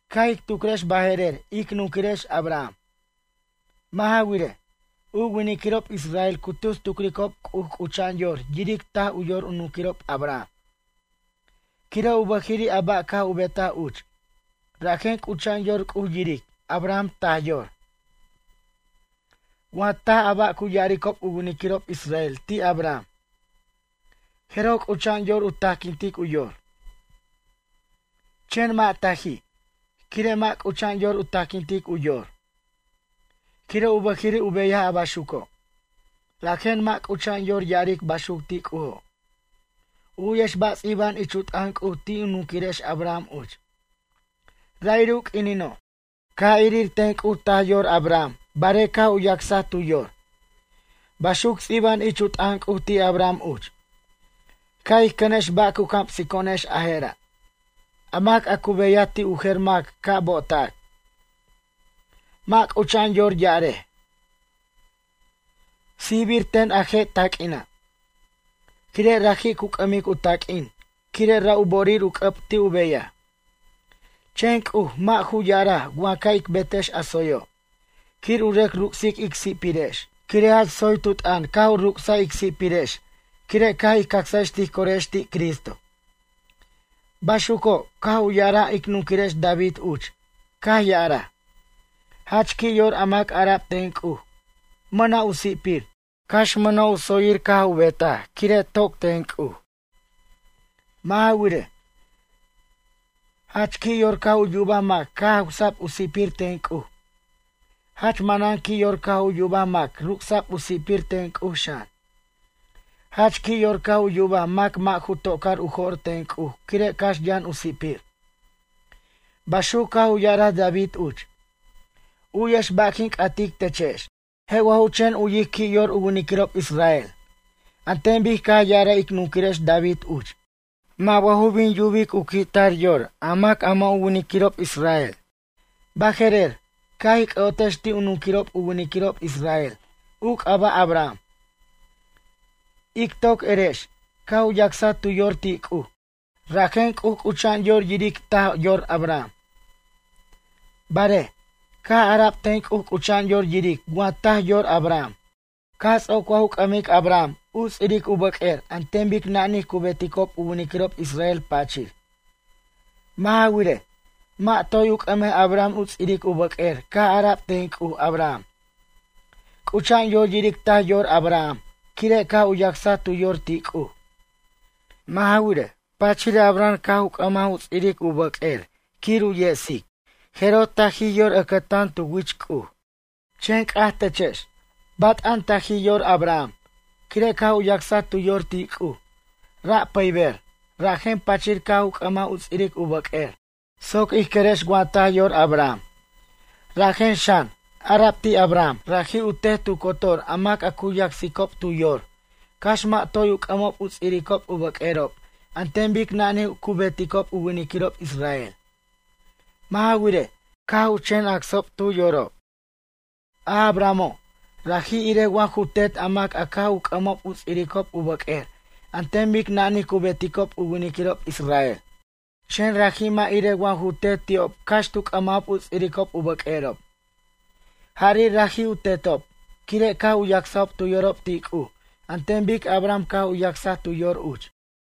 Ca' ij tucrex baje'rer ic nunquirex Abraham. Mʌ' ja wirej, u winiquirob israel cu tus tucricob C'uj c'ucha'an yor yiric taj yor u nunquirob Abraham, quire' u bʌjiri' a ba' caj u betaj uch, rajen c'ucha'an yor C'uj yiric Abraham taj yor. Wa taj a ba' cu ya'aricob u winiquirob israel ti' Abraham, jeroj c'ucha'an yor u tajquintic u yor. Chen mʌ' taji', quire' mʌ' c'ucha'an yor u tajquintic u yor, quire' u bʌjiri' u beyaj a baxuco'. Rajen mʌ' c'ucha'an yor ya'aric baxuc ti' C'ujo'. U'yex ba' ts'iba'an ich u t'ʌn C'uj ti' ic nunquirex Abraham uch: “Ra'iri' u q'uinino', caj irir ten C'uj taj yor Abraham barej caj u yacsaj tu yor”, baxuc ts'iba'an ich u t'ʌn C'uj ti' Abraham uch. Ca' ij cʌnex ba' cu camsico'onex a je' ra'. A mac a cu beyaj ti' u jer mac ca' bo'otac. Mʌ' c'ucha'an yor ya'arej: “Sijbir ten a je' taq'uina'.” Quire raji' cu c'ʌmic u taq'uin, quire' ra' u bo'orir u c'ʌb ti' u beyaj. Chen C'uj, mʌ' ju ya'araj wa ca' ic betex a tsoyo', quir u rʌc ruc'sic ic si'pirex, quire' jach tsoy tu t'ʌn caj u ruc'saj ic si'pirex, quire' caj ij cacsex ij corex ti' Cristo. Baxuco', caj u ya'araj ic nunquirex David uch, caj ya'araj: “Jach qui' yor a mac a ara'b ten C'uj, mʌna' u si'pir, cax mʌna' yutsir caj u betaj quire' toc ten C'uj.” Mʌ' ja wirej: Jach qui' yor caj u yubaj mac caj jawsa'b u si'pir ten C'uj. Jach manan qui' yor caj u yubaj mac ruc'sa'b u si'pir ten C'uj xan. Jach qui' yor caj u yubaj mac mʌ' ju tocar u jo'r ten C'uj quire' cax yʌn u si'pir. Baxuc caj u ya'araj David uch. U'yex ba' quin c'atic techex. Je' wa ju chen u'yic qui' yor u winiquirob israel, an ten bic caj ya'araj ic nunquirex David uch? Mʌ' wa ju bin yubic u qui'tar yor a mac a mʌ' ju winiquirob israel? Baje'rer, ca' ij c'ʌ'otex ti' u nunquirob u winiquirob israel, u c'aba' Abraham. Ic toc erex, caj u yacsaj tu yor ti' C'uj, rajen C'uj c'ucha'an yor yiric taj yor Abraham. Barej, caj ara'b ten C'uj c'ucha'an yor yiric wa taj yor Abraham, caj ts'oc wa ju c'ʌmic Abraham u ts'iric u bʌq'uer an ten bic nanij cu beticob u winiquirob israel pachir. Mʌ' ja wirej, mʌ' toy u c'ʌmaj Abraham u ts'iric u bʌq'uer caj ara'b ten C'uj Abraham. C'ucha'an yor yiric taj yor Abraham, quire' caj u yacsaj tu yor ti' C'uj. Mʌ' ja wirej, pachir Abraham caj u c'ʌmaj u ts'iric u bʌq'uer quir u yesic jeroj tajij yor ʌcʌtan tu wich C'uj. Chen c'aj techex, bat'an tajij yor Abraham, quire' caj u yacsaj tu yor ti' C'uj, ra' pʌyber, rajen pachir caj u c'ʌmaj u ts'iric u bʌq'uer, soc ij querex wa taj yor Abraham. Rajen xan, ara'b ti' Abraham, raji' u tet tu cotor a mac a cu yacsicob tu yor, cax mʌ' toy u c'ʌmob u ts'iric u bʌq'uerob an ten bic nanij cu beticob u winiquirob israel. Mʌ' ja wirej, caj u chen acsob tu yorob. A Abrahamo', raji' irej wa ju tet a mac a caj u c'ʌmob u ts'iric u bʌq'uer an ten bic nanij cu beticob u winiquirob israel. Chen raji' mʌ' irej wa ju tet ti'ob cax tu c'ʌmajob u ts'iric u bʌq'uerob. Jari' raji' u tetob, quire' caj u yacsob tu yorob ti' C'uj an ten bic Abraham caj u yacsaj tu yor uch.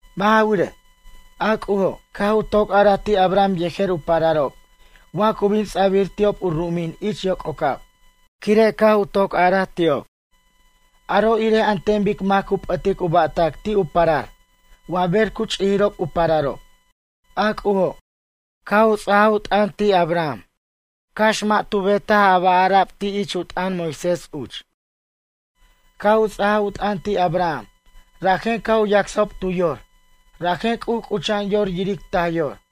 Mʌ' ja wirej, a C'ujo', caj u toc araj ti' Abraham yejer u pararob wa cu bin ts'abir ti'ob u ru'umin ich yoc'ocab, quire' caj toc araj ti'ob. Aro' irej an ten bic mac cu p'ʌtic u ba'tac ti' u parar, wa ber cu ch'ijirob u pararob. A C'ujo', caj u ts'ajaj u t'ʌn ti' Abraham, cax mʌ' tu bet a ba' ara'b ich u t'ʌn Moisés uch. Caj u ts'ajaj u t'ʌn ti' Abraham, rajen caj u yacsob tu yor, rajen C'uj c'ucha'an yor yiric taj yor.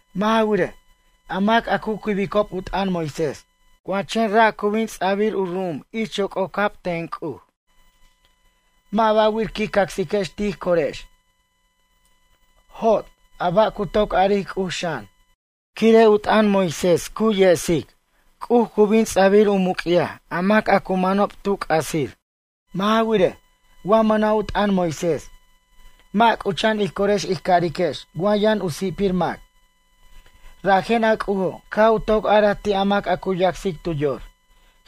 Mʌ' ja wirej, a mac a cu quibicob u t'ʌn Moisés, wa chen ra' cu bin ts'abir u ru'um ich yoc'ocab ten C'uj. Mʌ' ba'wir quij cacsiquex tij corex. Jot, a ba' cu toc aric C'uj xan. Quire' u t'ʌn Moisés cu yesic C'uj cu bin ts'abir u muc'yaj a mac a cu manob tu c'asir. Mʌ' ja wirej, wa mʌna' u t'ʌn Moisés, mʌ' c'ucha'an ij corex ij cariquex wa yʌn u si'pir mac. Rajen a C'ujo', caj u toc araj ti' mac a cu yacsic tu yor,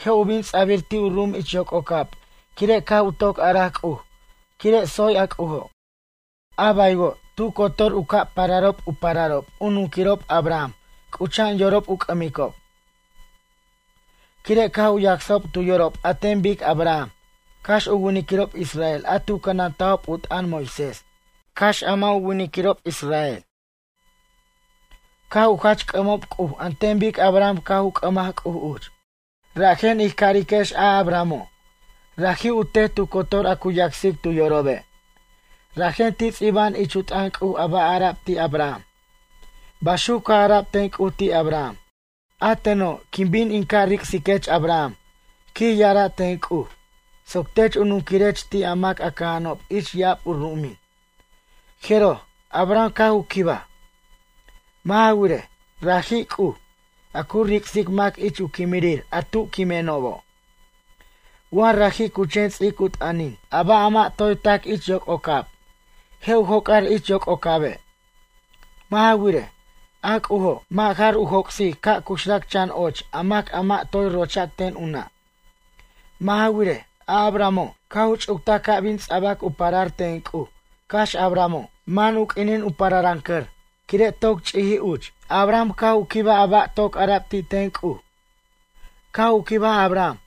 je' u bin ts'abir ti' u ru'um ich yoc'ocab quire' caj u toc araj C'uj, quire' tsoy a C'ujo'. A baywo', tu cotor u ca' pararob u pararob u nunquirob Abraham c'ucha'an yorob u c'ʌmicob, quire' caj u yacsob tu yorob an ten bic Abraham, cax u winiquirob israel a tu cʌnantajob u t'ʌn Moisés, cax a mʌ' ju winiquirob israel. Caj u jach c'ʌmob C'uj an ten bic Abraham caj u c'ʌmaj C'uj uch. Rajen ij cariquex a Abrahamo', raji' u tet tu cotor an cu yacsic tu yorobe'. Rajen ti' ts'iba'an ich u t'ʌn C'uj a ba' ara'b ti' Abraham. Baxuc caj ara'b ten C'uj ti' Abraham: “A teno', quin bin in ca' ric'siquech Abraham, quij ya'ara' ten C'uj, soc tech u nunquirech ti' a mac a cʌja'anob ich ya'ab u ru'umin.” Jeroj, Abraham caj u quibaj. Mʌ' ja wirej, raji' C'uj, a cu ric'sic mac ich u quimirir a tu quimenobo'. Wa raji' cu chen ts'ic u t'ʌnin, a ba' a mʌ' toy tac ich yoc'ocab, je' u joc'ar ich yoc'ocabe'. Mʌ' ja wirej, a C'ujo', mʌ' jar u joc'sic ca' cuxrac chan och a mac a mʌ' toy rochac ten u nʌ'. Mʌ' ja wirej, a Abrahamo', caj u ch'uctaj ca' bin ts'abac u parar ten C'uj, cax a Abrahamo', man u q'uinin u pararʌncʌr, quire' toc ch'ijij uch. Abraham caj u quibaj a ba' toc ara'b ti' ten C'uj. Caj u quibaj Abraham,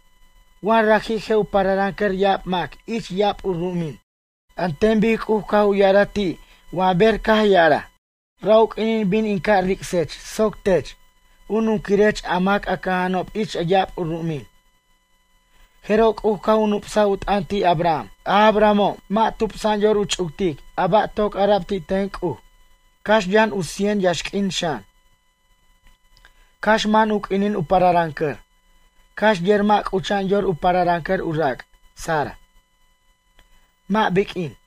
wa raji' je' u pararʌncʌr ya'ab mac ich ya'ab ru'umin, an ten bic C'uj caj u ya'araj ti' wa ber caj ya'araj: “Ra' u q'uinin bin in ca' ric'sech soc tech, u nunquirech a mac a cʌja'anob ich ya'ab ru'umin.” Jeroj C'uj caj u nup'saj u t'ʌn ti' Abraham. A Abrahamo', mʌ' tubsa'an yor u ch'uctic a ba' toc ara'b ti' ten C'uj, cax yʌn u cien yaxq'uin xan, cax man u q'uinin u pararʌncʌr, cax yer mʌ' c'ucha'an yor u pararʌncʌr u rac' Sara, mʌ' biq'uin.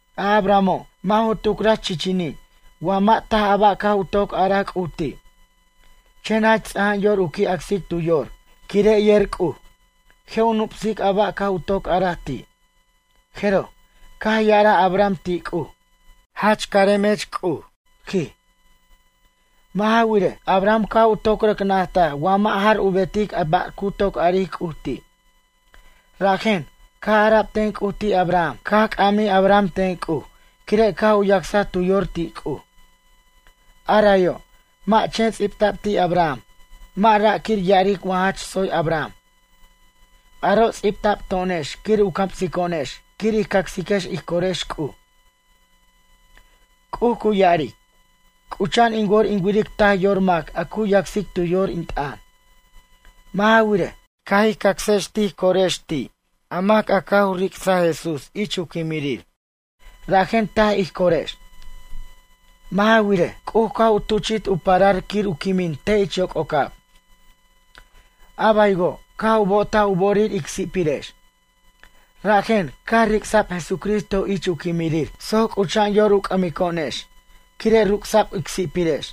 A Abrahamo', mʌ' ju tucraj chichini', wa mʌ' taj a ba' caj u toc araj C'uj ti'. Chen jach ts'aja'an yor u qui' acsic tu yor, quire' yer C'uj, je' u nup'sic a ba' caj u toc araj ti'. Jeroj, caj ya'araj Abraham ti' C'uj: “Jach caremech C'uj”, quij. Mʌ' ja wirej, Abraham caj u toc rʌc najtaj wa mʌ' jar u betic a ba' cu toc aric C'uj ti'. Rajen, caj ara'b ten C'uj ti' Abraham, caj c'amij Abraham ten C'uj, quire' caj u yacsaj tu yor ti' C'uj. A rayo', mʌ' chen ts'ibta'b ti' Abraham, mʌ' ra' quir ya'aric wa jach tsoy Abraham. Aro' ts'ibta'b to'onex quir u camsico'onex quir ij cacsiquex ij corex C'uj. C'uj cu ya'aric: “C'ucha'an in wor in wiric taj yor mac a cu yacsic u yor ti' in t'ʌn.” Mʌ' ja wirej, caj ij cacsex tij corex ti' a mac a caj u ric'saj Jesús ich u quimirir, rajen taj ij corex. Mʌ' ja wirej, C'uj caj u tuchi't u parar quir u quimin te' ich yoc'ocab. A baywo', caj u bo'otaj u bo'orir ic si'pirex. Rajen, caj ric'sa'b Jesucristo ich u quimirir soc c'ucha'an yor u c'ʌmico'onex, quire' ruc'sa'b ic si'pirex.